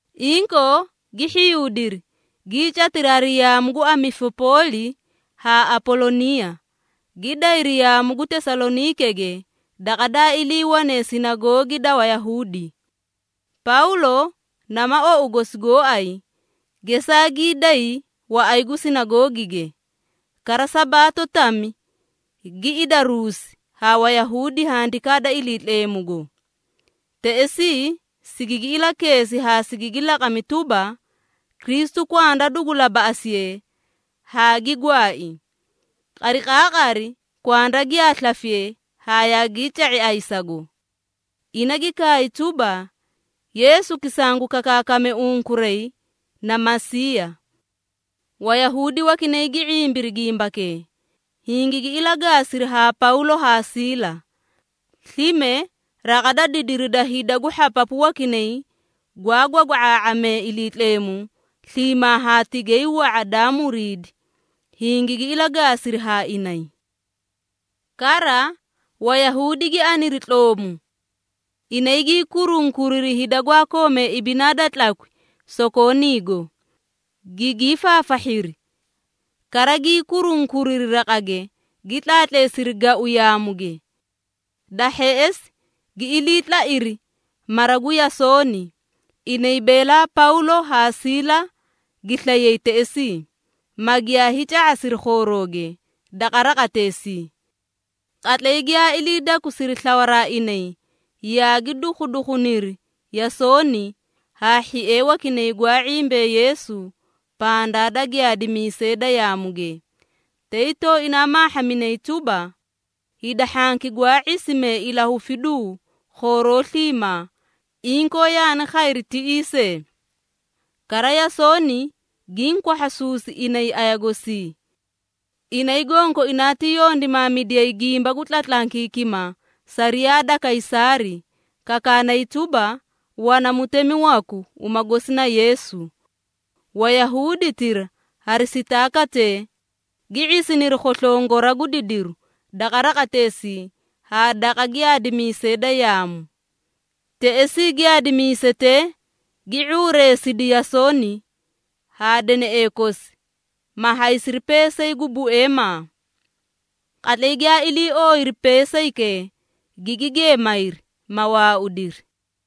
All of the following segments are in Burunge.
Inkoo gi hhiyuudiri, gii catiri hari yaamu gu Amifipooli haa Apoloniiya, gi dayri yaamu gu Tesaloniikege daqa daa iliiwane Sinagoogi da Wayahuudi. Pawlo nama ou gosi gooay, gesaa gii day waꞌay gu sinagoogige, kara Sabaato tami gi idaruusi haa Wayahuudi Handikaa da Iliitleemugo. Teꞌesii sigigi ilakeesi haa sigigi laqami tuba, Kristu kwanda dugu labaꞌasiye haa gi gwaai. Qariqaaqari kwanda giyaa slafiye haa yaagii ca⁄i ayisago. Ina gi kaay tuba, “Yeesuki sangu kakaakaame unkuray na Masiiya.” Wayahuudi wakinay gi ⁄imbiri gimbakee, hingigi ilagaasiri haa Pawlo haa Siila. Slime raqa da didiri da hida gu hhapapu wakinay gwaa gwagwa⁄aa⁄amee Iliitleemu sliimaa haa tigay wa⁄a daa muriidi, hingigi ilagaasiri haa inay. Kara, Wayahuudi gi aniri tloomu. Inay gii kurunkuriri hida gwaa koomee ibinaa da tlakwi sokooniigo, gigii faafahhiri, kara gii kurunkuriri raqage, gi tlaatleesiri gau yaamuge. Da hheꞌesi gi ilii tlairi mara gu Yasooni, inay beelaa Pawlo haa Siila gi slayay teꞌesii, ma giyaa hiica⁄asiri khoorooge daqa raqateesii. Qatlay giyaa ilii dakusiri slawaraa inay, yaagi dukhudukhuniri Yasooni haa hhiee wakinay gwaa ⁄imbee Yeesu pandaa da giyaadimiisee da yaamuge, tay tooina maahhaminay tuba, “Hida hhanki gwaa ⁄isimee ilahufiduu khooroo sliimaa, inkoo yaani khayri tiꞌii see. Kara Yasooni giĩ kwahhasuusi inay aya gosii. Inay gonkoinaa ti yondimaamidiyay gimba gu tlatlankiikima sariyaa da Kaysaari, kakaanay tuba, wana mutemi waku uma gosi na Yeesu.” Wayahuuditira hari sitaakatee, gi ⁄isiniri khoslongora gu didiru daqa raqateesii haa daqa giyaadimiisee da yaamu. Teꞌesii giyaadimiisetee gi ⁄uureesidi Yasooni haa deneꞌee kosi, ma haysiri peesay gu bueemaa. Qatlay giyaa ilii ooyiri peesaykee, gigi geemayri, ma waaudiri.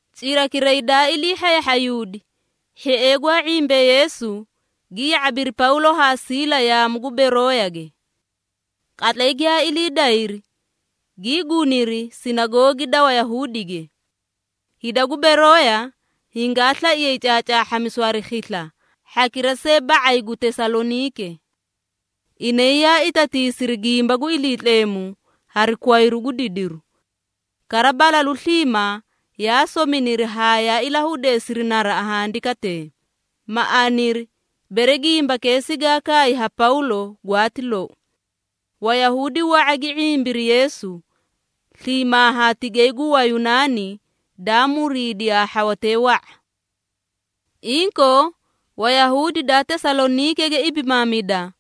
Cirakiray daa ilii hhayahhayuudi, hhiee gwaa ⁄imbee Yeesu, gi ya⁄abiri Pawlo haa Siila yaamu gu Berooyage. Qatlay giyaa ilii dayri, gii guniri sinagoogi da Wayahuudige. Hida gu Berooya hingaa slaiyay caacaahhamisu hari khisla hhakira see ba⁄ay gu Tesaloniike. Inay yaa itatiisiri gimba gu Iliitleemu hari kwayru gu didiru. Kara, balalu sliimaa yaa sominiri haa yaa ilahudeesiri naraꞌa handikatee, ma aniri, bere gimbakee sigaa kaay haa Pawlo gwaati lou. Wayahuudi wa⁄a gi ⁄imbiri Yeesu, sliimaa haa tigay gu Wayunaani daa muriidi haa hhawatee wa⁄a. Inkoo, Wayahuudi daa Tesaloniikege ibimaamida,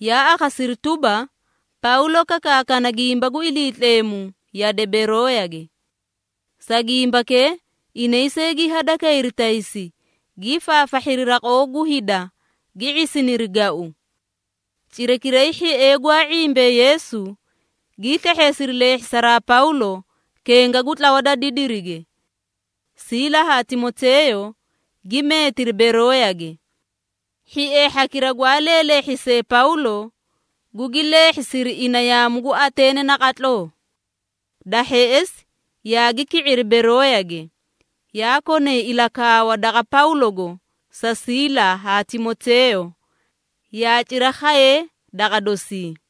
yaa akhasiri tuba, Pawlo kakaakana gimba gu Iliitleemu yade Berooyage. Sa gimbakee inay see gi hadakayri taysi, gii faafahhiri raqoo gu hida, gi ⁄isiniri gau. Cirakiray hhiee gwaa ⁄imbee Yeesu, gii slehheesiri leehhisaraa Pawlo kenga gu tlawa da didirige. Siila haa Timoteeyo gi meetiri Berooyage. Hhiee hhakira gwaa leelehhisee Pawlo, gugi leehhisiri ina yaamu gu Ateene naqatloo. Da hheꞌesi yaagi ki⁄iri Berooyage, yaa konay ilakaawa daqa Pawlogo sa Siila haa Timoteeyo yaa cira khayee daqa dosii.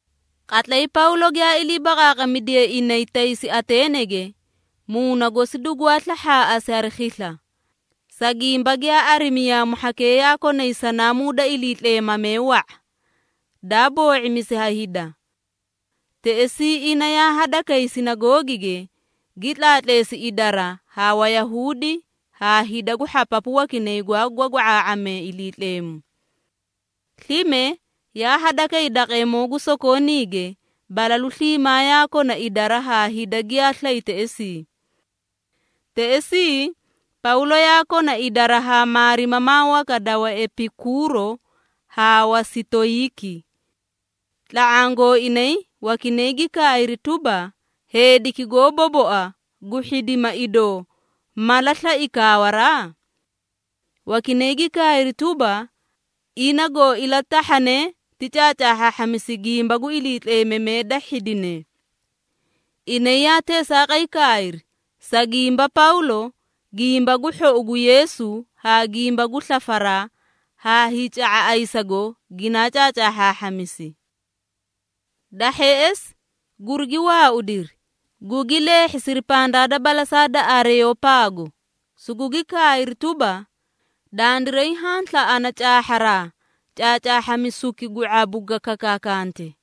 Qatlay Pawlo giyaa ilii baqaaqamidiye inay taysi Ateenege, muuna gosi dugwaa slahhaaꞌasi hari khisla, sa gimba giyaa arimi yaamu hhakee yaa konay sanaamuu da iliitleemamee wa⁄a, daa boo⁄imisi ha hida. Teꞌesii ina yaa hadakay sinagoogige, gi tlaatleesi idara haa Wayahuudi haa hida gu hhapapu wakinay gwaa gwagwa⁄aa⁄amee Iliitleemu. Slime yaa hadakay daqeemoo gu sokooniige, balalu sliimaa yaa kona idara haa hida giyaa slay teꞌesii. Teꞌesii Pawlo yaa kona idara haa maarimamaa waka da Waepikuuro haa Wasitoyiiki. Tla⁄aã gooinay wakinay gi kaayri tuba, “Heediki goó boboa gu hhidima idoo, mala slai kaawaraa?” Wakinay gi kaayri tuba, “Ina goo ilatahhane ti caacaahhaahhamisi gimba gu iliitleemamee da hhidine.” Inay yaa teesaaqay kaayri, sa gimba Pawlo Gimba gu Hhou gu Yeesu haa gimba gu slafaraa haa hiica⁄a ayisago ginaa caacaahhaahhamisi. Da hheꞌesi gurigi waaudiri, gugi leehhisiri pandaa da balasaa da Aareyopaago sugugi kaayri tuba, “Dandiray haã slaꞌana caahharaa caacaahhamisuki gu ⁄abu ga kakaakante.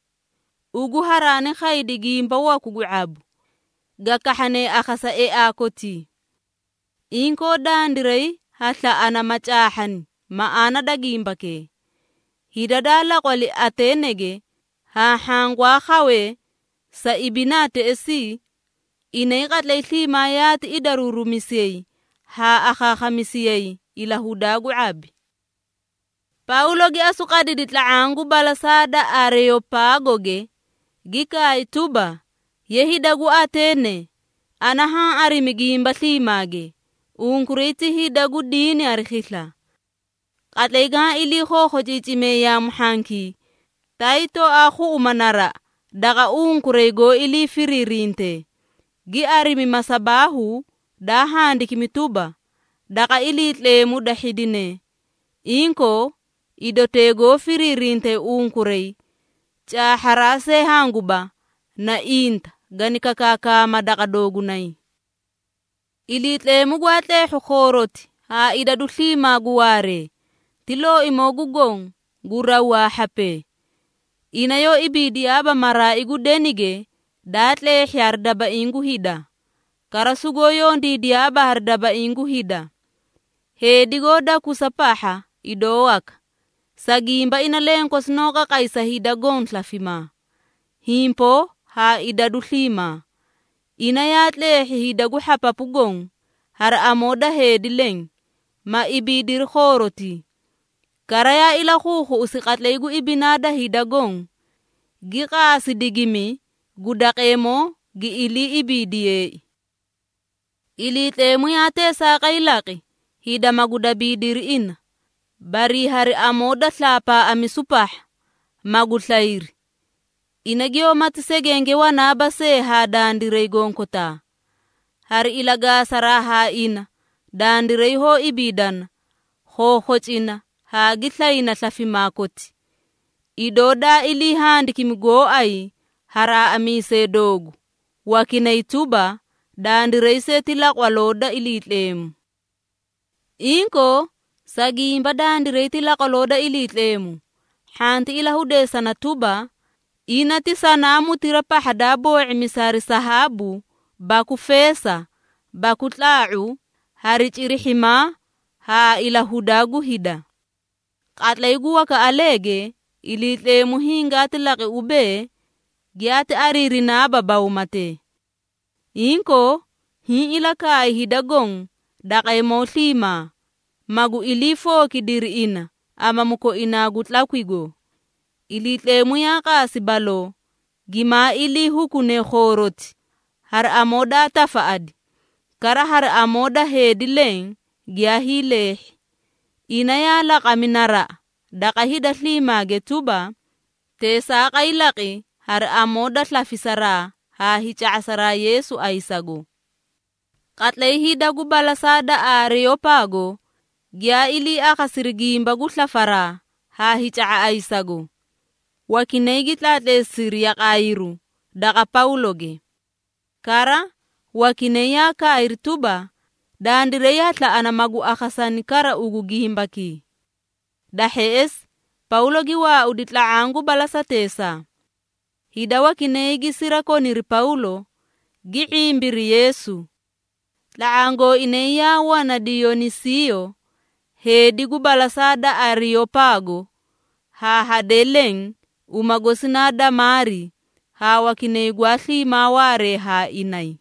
Ugu haraani khaydi gimba waku gu ⁄abu, ga kahhane akhasa eaa kotii. Inkoo dandiray ha slaꞌana ma caahhani maꞌaana da gimbakee.” (Hida daa laqwali Ateenege haa hhaã gwaa khawee sa ibinaa teꞌesii, inay qatlay sliimaa yaati idaruurumisiyay haa akhaakhamisiyayi ilahudaa gu ⁄abi.) Pawlo gi asu qadidi tla⁄aã gu balasaa da Aareyopaagoge, gi kaay tuba, “Ye hida gu Ateene! Ana haã arimi gimba sliimaage, unkuray ti hida gu diini hari khisla. Qatlay gaã ilii khookhociicime yaamu hhankii, tay tooaa khuꞌuma naraꞌa daqa unkuray goó ilii firiirintee, gi arimi masabaahu daa handikimi tuba, ‘Daqa Iliitleemu da hhidine.’ Inkoo idotee goó firiirinte unkuray caahharaa see hanguba, na inta gani kakaakaamaa daqa doogunay. Iliitleemu gwaa tleehhu khooroti haa idadu sliimaa gu waaree, ti Looimoo gu Goõ gu raw haa hhapee. Ina yoó ibiidiyaaba maraai gu denige daa tleehhi hari dabaiĩ gu hida. Kara sugoó yondiidiyaaba hari dabaiĩ gu hida, heedi goó dakusa pahha idoo waka, sa gimba ina lenkosi noó qaqay sa hida goõ slafimaa, himpoo haa idadu sliimaa. Ina yaa tleehhi hida gu hhapapu goõ, hari amoo da heedi leẽ, ma ibiidiri khoorotii. Kara yaa ilakhuukhuꞌusi qatlay gu ibinaa da hida goõ, gi qaasi digimi gu daqeemoo gi ilii ibiidiyeei. Iliitleemu yaa teesaaqay laqi, hida magu dabiidiri ina, barii hari amoo da slaapaaꞌamisu pahha, magu slayri. Ina giyoómati segenge wanaaba see haa dandiray gonkotaa. Hari ilagaasaraa haa ina, dandiray hoó ibiidana, khookhocina haa gi slayna slafimaa koti, idoo daa ilii handikimi gooay ha raaꞌamisee doogu wakinay tuba, ‘Dandiray see ti laqwaloo da Iliitleemu.’ Inkoo, sa gimba dandiray ti laqwaloo da Iliitleemu, hhanti ilahuudeesana tuba, ina ti sanaamutira pahha daa boo⁄imisi hari sahaabu baku feesa baku tlaa⁄u hari cirihhimaa haa ilahudaa gu hida. Qatlay gu wakaꞌaleege Iliitleemu hingaati laqi ubee, giyaati ariirinaaba bawmatee. Inkoo, hiĩ ilakaay hida goõ daqeemoo sliimaa, magu ilii fookidiri ina amamu koinaa gu tlakwigo. Iliitleemu yaa qaasi baloo gimaa ilii hukune khooroti hari amoo daa tafaꞌadi, kara hari amoo da heedi leẽ giyaa hiileehhi. Ina yaa laqami naraꞌa daqa hida sliimaage tuba, teesaaqay laqi hari amoo da slafisaraa haa hiica⁄asa Yeesu ayisago.” Qatlay hida gu balasaa da Aareyopaago giyaa ilii akhasiri gimba gu slafaraa haa hiica⁄a ayisago, wakinay gi tlaatleesiri yaqaayiru daqa Pawloge. Kara, wakinay yaa kaayri tuba, “Dandiray ha slaꞌana magu akhasani kara ugu gimbakii.” Da hheꞌesi Pawlo gi waaudi tla⁄aã gu balasateesaa. Hida wakinay gi sirakoniri Pawlo gi ⁄imbiri Yeesu. Tla⁄aã gooinay yaa wana Diyonisiiyo, heedi gu balasaa da Aareyopaago haa hadee leẽ uma gosi naa Damaari haa wakinay gwaa sliimaa waaree haa inay.